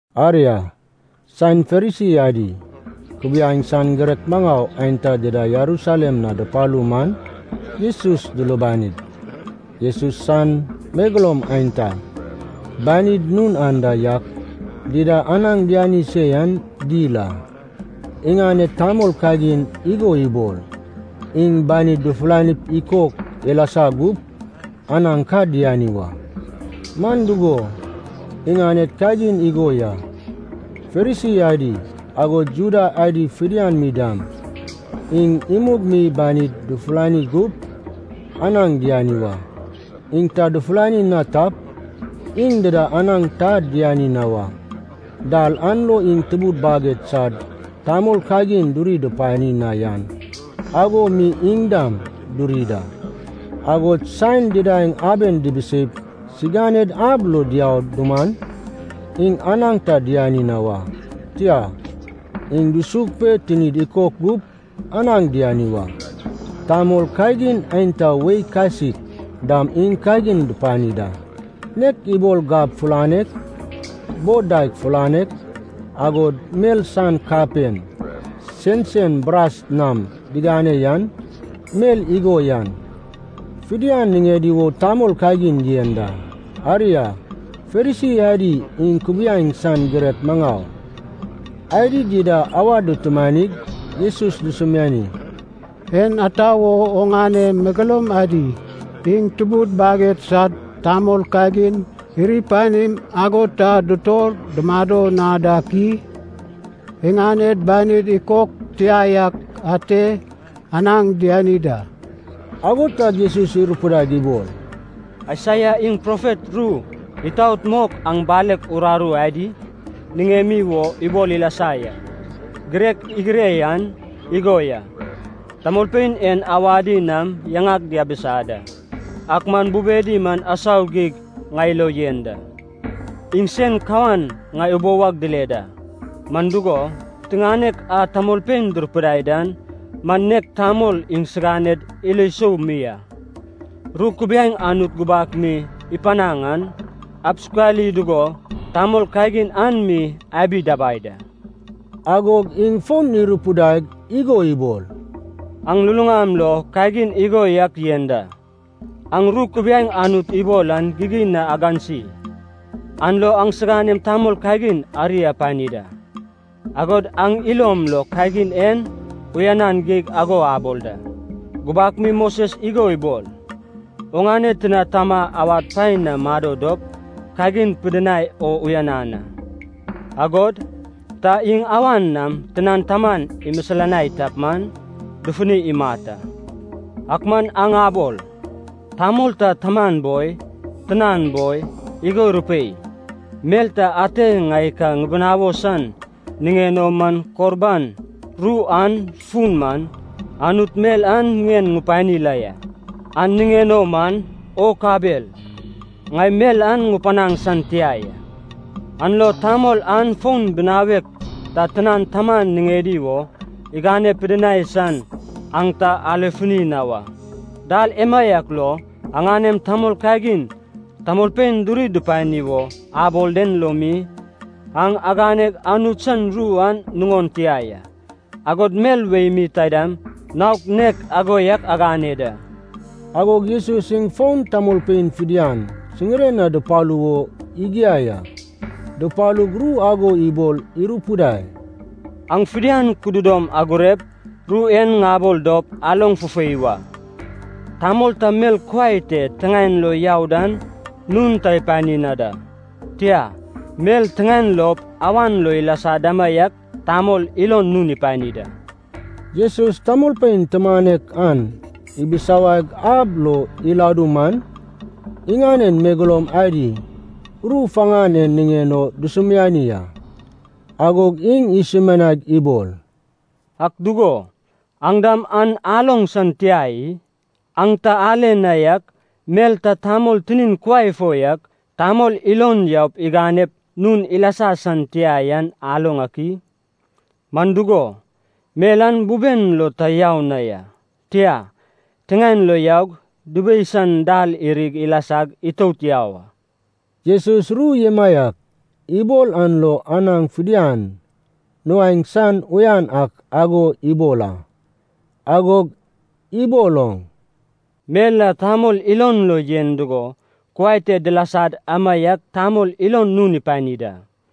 Aria, saen Farisi adi, kubiaeŋ san girek maŋau aenta dida Jerusalem na dupalu man, Jesus dulubanig, Jesus san megeloum aenta, banid nun anda yak dida anaŋ diani se yan dil a. Iŋaned tamol kagin igo ibol, iŋ banid dufulanip ikok ilasa gup anaŋ ka diani wa. (Man dugo, iŋaned kagin igo ya. Farisi adi, agod Juda adi fidian mi dam, iŋ imug mi banid dufulani gup anaŋ diani wa. Iŋ ta dufulani na tap, iŋ dida anaŋ ta diani na wa. Dal an lo iŋ tubud baged sad tamol kagin diri dupani na yan ago mi iŋ dam duri da. Agod saen didaeŋ aben dibiseip siganed ab lo diau duman, iŋ anaŋ ta diani na wa, tia, iŋ dusug pe tinid ikok gup anaŋ diani wa. Tamol kagin aenta wei kasik dam iŋ kagin dupani da. Nek ibol gab fulanek, bod daeg fulanek, agod mel san kapen sensen bras nam digane yan, mel igo yan fidian niŋedi wo tamol kagin yen da.) Aria, Farisi adi iŋ kubiaeŋ san girek maŋau adi dida awad dutumanig Jesus dusumiani, “En ata wo oŋane megeloum adi iŋ tubud baged sad tamol kagin iri panim ago ta dutor dumado na dak i? Iŋaned banid ikok tia yak ate anaŋ diani da.” Ago tag Jesus irupidaig ibol, “Aisaia iŋ profet ru itaot mok aŋ balek uraru adi niŋemi wo ibol ilasa ya. Girek igire yan igo ya, ‘Tamolpein en awadi nam yaŋag diabisa da, ak man bubedi man asau geig ŋai lo yen da. Iŋ sen kawan ŋai ubou ag dile da, man dugo, piteŋanek a tamolpein durupidai dan man nek tamol iŋsiganed ilo sou mi a.’ Ru kubiaeŋ Anut gubak mi ipanaŋ an, absukali dugo tamol kagin an mi abi dabai da.” Agog iŋ fon irupidaig igo ibol, “Aŋ luluŋam lo kagin igo yak yen da. Aŋ ru kubiaeŋ Anut ibol an gigin na agansi, an lo aŋsiganem tamol kagin ari apani da. Agod aŋ ilom lo kagin en uyanan geig ago abol da! Gubak mi Moses igo ibol, ‘Oŋane tina tama awad paen na mado dop kagin pidinai o uyanan a.’ Agod, ‘Ta iŋ awan nam tinan taman imisilanai tap man, dufuni imat a.’ Ak man aŋ abol, ‘Tamol ta taman boi, tinan boi, igo irupei, mel ta ate ŋai ka ŋibinawo san niŋen o man Korban’ (ru an fun man, Anut mel an ŋien ŋupani la ya), ‘an niŋen o man, o kabel, ŋai mel an ŋupanaŋ san tia ya.’ An lo tamol an fon binawek ta tinan taman niŋedi wo igane pidinai san aŋ ta alefuni na wa. Dal emaiak lo, aŋanem tamol kagin tamolpein duri dupani wo abol den lo mi, aŋ aganeg Anut san ru an nuŋon tia ya. Agod mel wei mi taidam naok nek ago yak agane da.” Agog Jesus iŋ fon tamolpein fidian siŋiren na dupalu wo igiai a. Dupalug, ru ago ibol irupidai, “Aŋ fidian kududom agurep, ru en ŋabol dop, aloŋ fufei wa. Tamol ta mel kuai tep tiŋaen lo yau dan nun ta ipani na da. Tia, mel tiŋaen lop awan lo ilasa damaiak tamol ilon nun ipani da.” Jesus tamolpein tumanek an ibisawaig ab lo iladu man, iŋanen megeloum adi ru faŋan en niŋen o dusumiani a. Agog iŋ isumianaig ibol, “Ak dugo, aŋ dam an aloŋ san tia i? Aŋ ta ale na yak, mel ta tamol tinin kuai fo yak, tamol ilon yaup iganep nun ilasa san tia yan aloŋ ak i? Man dugo, mel an buben lo ta yau na ya, tia, tiŋaen lo yaug dubei san dal irig ilasag itout yau a.” (Jesus ru emaiak ibol an lo anaŋ fidian nuaeŋ san uyan ak ago ibol a.) Agog ibol oŋ, “Mel a tamol ilon lo yen dugo kuai te dilasad amaiak tamol ilon nun ipani da.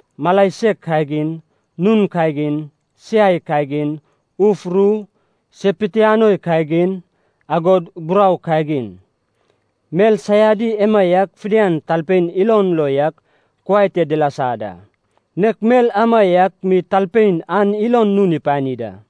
mala sek kagin, nun kagin, siai kagin, uf ru, se pitianoi kagin, agod burau kagin. Mel saiadi emaiak fidian talpein ilon lo yak kuai te dilasa da, nek mel amaiak mi talpein an ilon nun ipani da.”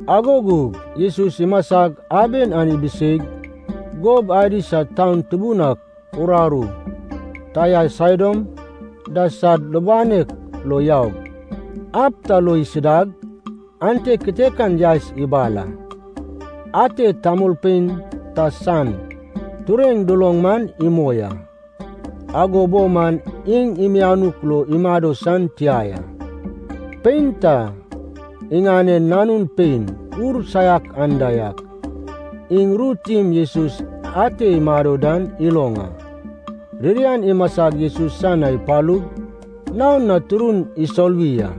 Ago gug Jesus imasag, aben an ibiseig, gob adi sad taun tubun ak uraru, Tair Saidon da sad lubanek lo yaug, ab ta lo isidag, ante kitekan yaes ibal a, ate tamolpein ta san tureŋ duloŋ man imoi a. Ago bo man iŋ mianuk lo imado san tia ya. Pein ta iŋanen nanun pein ur saiak anda yak iŋ ru tim Jesus ante imado dan iloŋ a. Ririan imasag Jesus san na ipalug, naon na turun isoluwi a.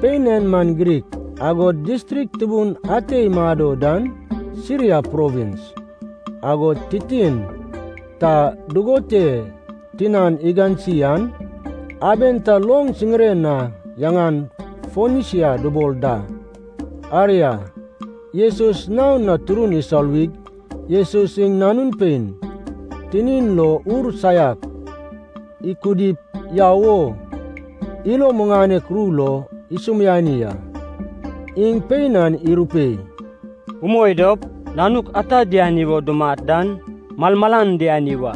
Pein en man Grik, agod distrik tubun ate imado dan Siria provins, agod titin ta dugon te tinan igansi an aben ta loŋ siŋiren na yaŋan Fonesia dubol da. Aria, Jesus naon na turun isoluwig, Jesus iŋ nanun pein tinin lo ur saiak ikudip yau wo ilo muŋanek ru lo isumiani a. Iŋ pein an irupei, “Umoi dop, nanuk ata diani wo dumat dan malmalan diani wa.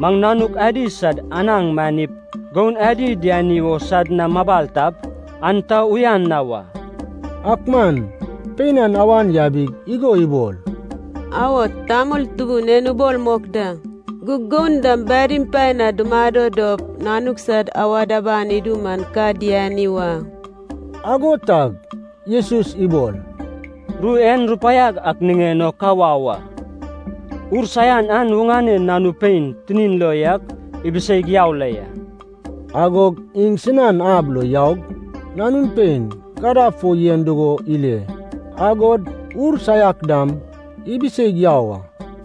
Maŋ nanuk adi sad anaŋ miŋanep goun adi diani wo sad na mabal tap, an ta uyan na wa.” Ak man pein an awan yabig igo ibol, “Awo, tamol Tubun en ubol mok da. Gug goun dam badim paen na dumado dop, nanuk sad awad aban idu man ka diani wa.” Ago tag Jesus ibol, “Ru en rupaiag ak niŋen o ka wau a. Ur saian an oŋane nanu pein tinin lo yak ibiseig yau la ya.” Agog iŋ sinan ab lo yaug nanun pein gadab fo yen dugo ile, agod ur saiak dam ibiseig yau a.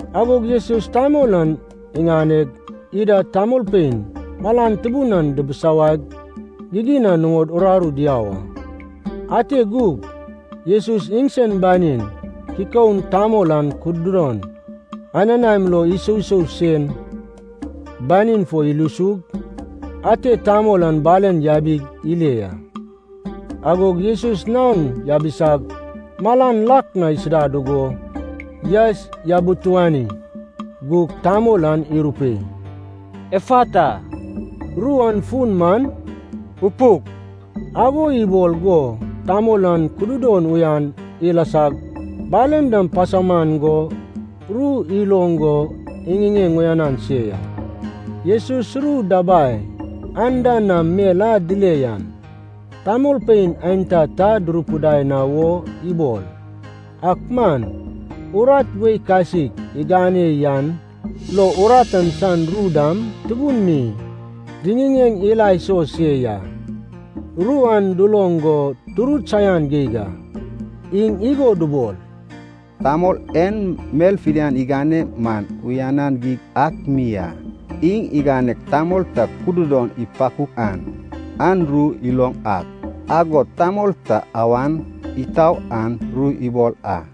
Agog Jesus tamol an iŋaneg, ida tamolpein malan tubun an dibisawaig gigin na nuŋod uraru diau a. Ante gug Jesus iŋsen banin kikoun tamol an kududon anenaim lo isousoug sen banin fo ilusug, ate tamol an balen yabi ile ya. Agog Jesus naon yabisag malan lak na isida dugo yaes yabituani gug tamol an irupei, “Efata.” (Ru an fun man: upuk.) Ago ibol go tamol an kududon uyan ilasag balen dam pasauman go ru iloŋ go iŋiŋeŋ uyanan se ya. Jesus ru dabai anda nam mel a dile yan tamolpein aenta ta durupidai na wo ibol. Ak man urat wei kasik igane yan lo urat an san ru dam tubun mi diŋiŋeŋ ila iso se ya. Ru an duloŋ go durut saian geig a. Iŋ igo dubol, “Tamol en mel fidian igane man uyanan geig ak mi a. Iŋ iganeg tamol ta kududon ipakuk an ru iloŋ ak, agod tamol ta awan itau an ru ibol a.”